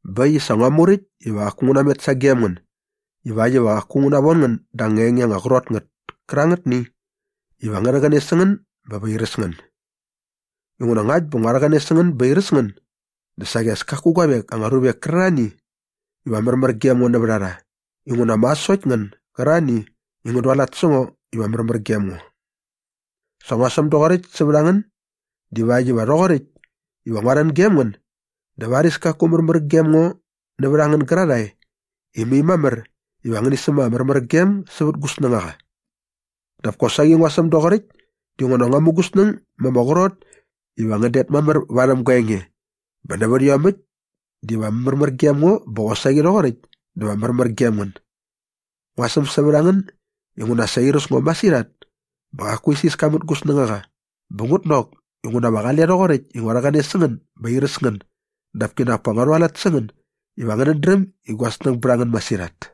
Bä äkt i sa ngua muräkt iva qaku ngu namet sagem ngän ivakt iva qaku ngu navon ngän da anga enge anga qrot ngät kärangätni iva ngä rhäqäne sä ngän bä va airäs ngän. Inguna ngakt bä ngua rhäqäne sä ngän bä airäs ngän dä saqi as kaku guavek anga ruvek kärarhani iva märmär gem ngo nävät a rha inguna ma sokt ngän gärarhani i ngän dualat sä ngo iva märmär gem ngo. Sa ngua säm doqoräkt sävät a ngän divakt iva rhoqoräkt iva ngua rhän gem ngän dä varis kaku märmär gem ngo nävät a ngän gärarhae i mai mamär iva ngäni säm ama märmärgem sävät gu snängaqa. Dap kosaqi ngua säm doqoräkt dinguna ngua mu gu snäng ma ama qrot iva ngän det mamär varhäm gua enge bä nävät iomäkt diva märmär gem ngo bä qosaqi rhoqoräkt dä va märmär gem ngän. Ngua säm sävät a ngän inguna sa airäs ngo masirhat bä qaku isiska mät gu snängaqa bä ngut nok inguna va qale rhoqoräkt i ngua rhäqäne sä ngän bä airäs ngän dap kinak pa ngua rhualat sä ngän iva ngänät dräm i gua snäng bät a ngän masirhat.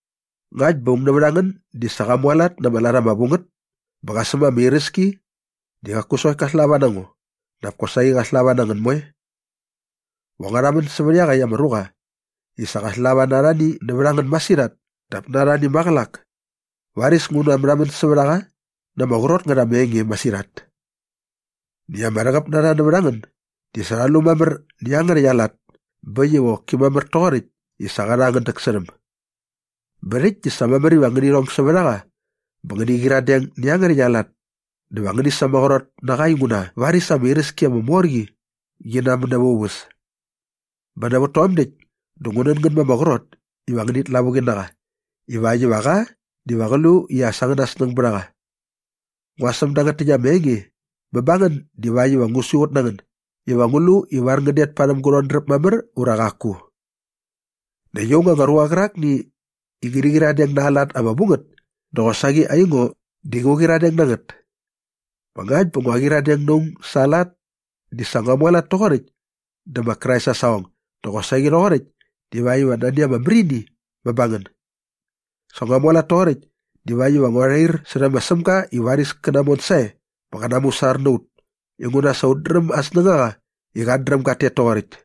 Ngakt bä aung nävät a ngän di sa qa mualat na ama lat ama vu ngät bä qa säm ama iräski di qaku sokt ka slava na ngo dap kosaqi qa slava na ngän moe. Va ngua rhamän sävät iaqäkt ama ruqa i sa qa slava na arhani nävät a ngän masirhat dap na arhani maqälak. Varis ngu natmärhamän sävät a qa na ama qrot ngät ama enge masirhat. Näkt ama rhäqäp na rha nävät a ngän di sa rha lu mamär nä iangärhäkt aa lat bä äkt i qoki mamär toqoräkt i sa qa rha angän däksärhäm. Bä rhäkt di sa mamär iva ngäni rhong sävät a qa bä ngäni qyiradeng nä iangärhäkt aa lat dä va ngäni sämaqrot na qa inguna varis ama iräski ama mor qi qi namän näva aa uväs. Bä nävät tom däkt dä ngu nän ngän ma ama qrot iva ngänit lavuqi na qa ivakt iva qa diva qä lu i as angäna snäng bät a qa. Ngua säm dangät täkt ama enge bä ba ngän divakt iva ngu siqut na ngän iva ngu lu ivar ngän det parhäm gu rhodräp mamär ura qaku. Näkt aung anga ruqa qärakni i ngäni qyiradeng na aa lat ama vu ngät di qosaqi aingo di ngu qyiradeng na ngät. Bä ngakt bä ngua qyiradeng na aung sa aa lat di sa ngua mualat toqoräkt dä ma Krais aa saqong dä qosaqi rhoqoräkt divakt iva nani ama märini bä ba ngän. Sa ngua mualat toqoräkt divakt iva ngua rhair särhä ma Sämga i varis kä namon sae bä qä namusar na ut inguna sa ut dräm aa snängaqa i qat dräm gat tet toqoräkt.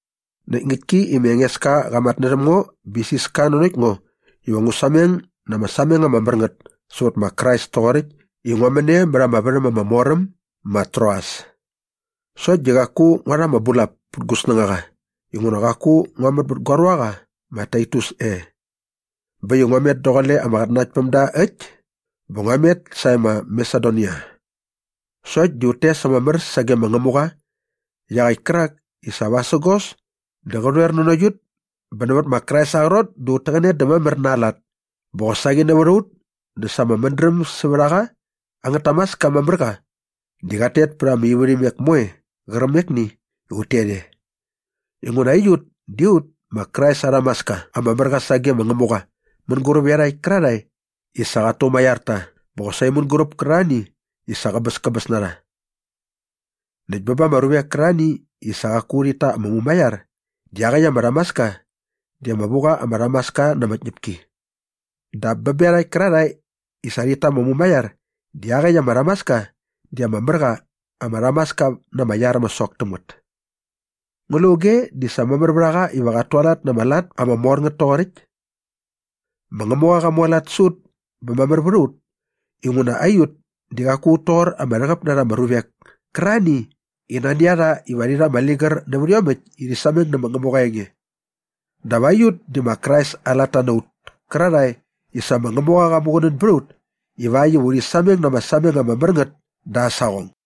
Näkt ngäktki i ma Engeska qa matnärhäm ngo bä sa isiska nanokt ngo iva ngu sameng na ama sameng ama mär ngät sävät ma Krais toqoräkt i ngua män e mät ama värhäm ama mor äm ma Troas sokt di qaku ngua rha ama bulap pät gu snängaqa inguna qaku ngua män bät gua ruaqa ma Taitus e. Bä äkt i ngua met daqule ama qatnanaktpämda äkt bä ngua met sae ma Masedonia. Sokt di ut tes ama mär sage ma Ngämuqa iaqäkt kärak i sa vasägos dä qä rhoer nanokt ut bä nävät ma Krais aa qrot dä ut täqäne dä mamär na aa lat bä qosaqi nävät a ut dä sa ama mädräm sävät a qa angät tamaska ama mär qa di qat tet pät ama ivärhimek moe qärqämekni i ut tet e. Inguna aiut di ut ma Krais aa rhamaska ama mär qa sage ma Ngämuqa mänguräp iarhakt kärarhae i sa qat tumaiar ta bä qosaqi mänguräp kärarhani i sa qäbäskäbäs na rha. Näkt bä ba ama ruvek kärarhani i sa qaku rhit ta ama mumaiar di iaqäkt ama rhamaska di ama vu qa ama rhamaska na ama tñäpki. Dap bä bä iarhakt kärarhae i sa rhit ta ama mumaiar di iaqäkt ama rhamaska di ama mär qa ama rhamaska na ama iar ama sok täm ngät. Ngu lu auge di sa mamär vät a qa iva qat tualat na ama lat ama mor ngät toqoräkt? Ma Ngämuqa qa mualat sä ut bä mamär vät a ut inguna aiut di qaku ut toqor ama rhäqäp na rha ama ruvek kärarhani i nani a rha iva rhi rha ama ligär nävät iomäkt i rhi sameng nä ma Ngämuqa aa enge. Dap aiut di ma Krais aa latta na ut kärarhae i sa ma Ngämuqa qa muqunän bät a ut ivakt iva urhi sameng na ama sameng ama mär ngät da aa saqong.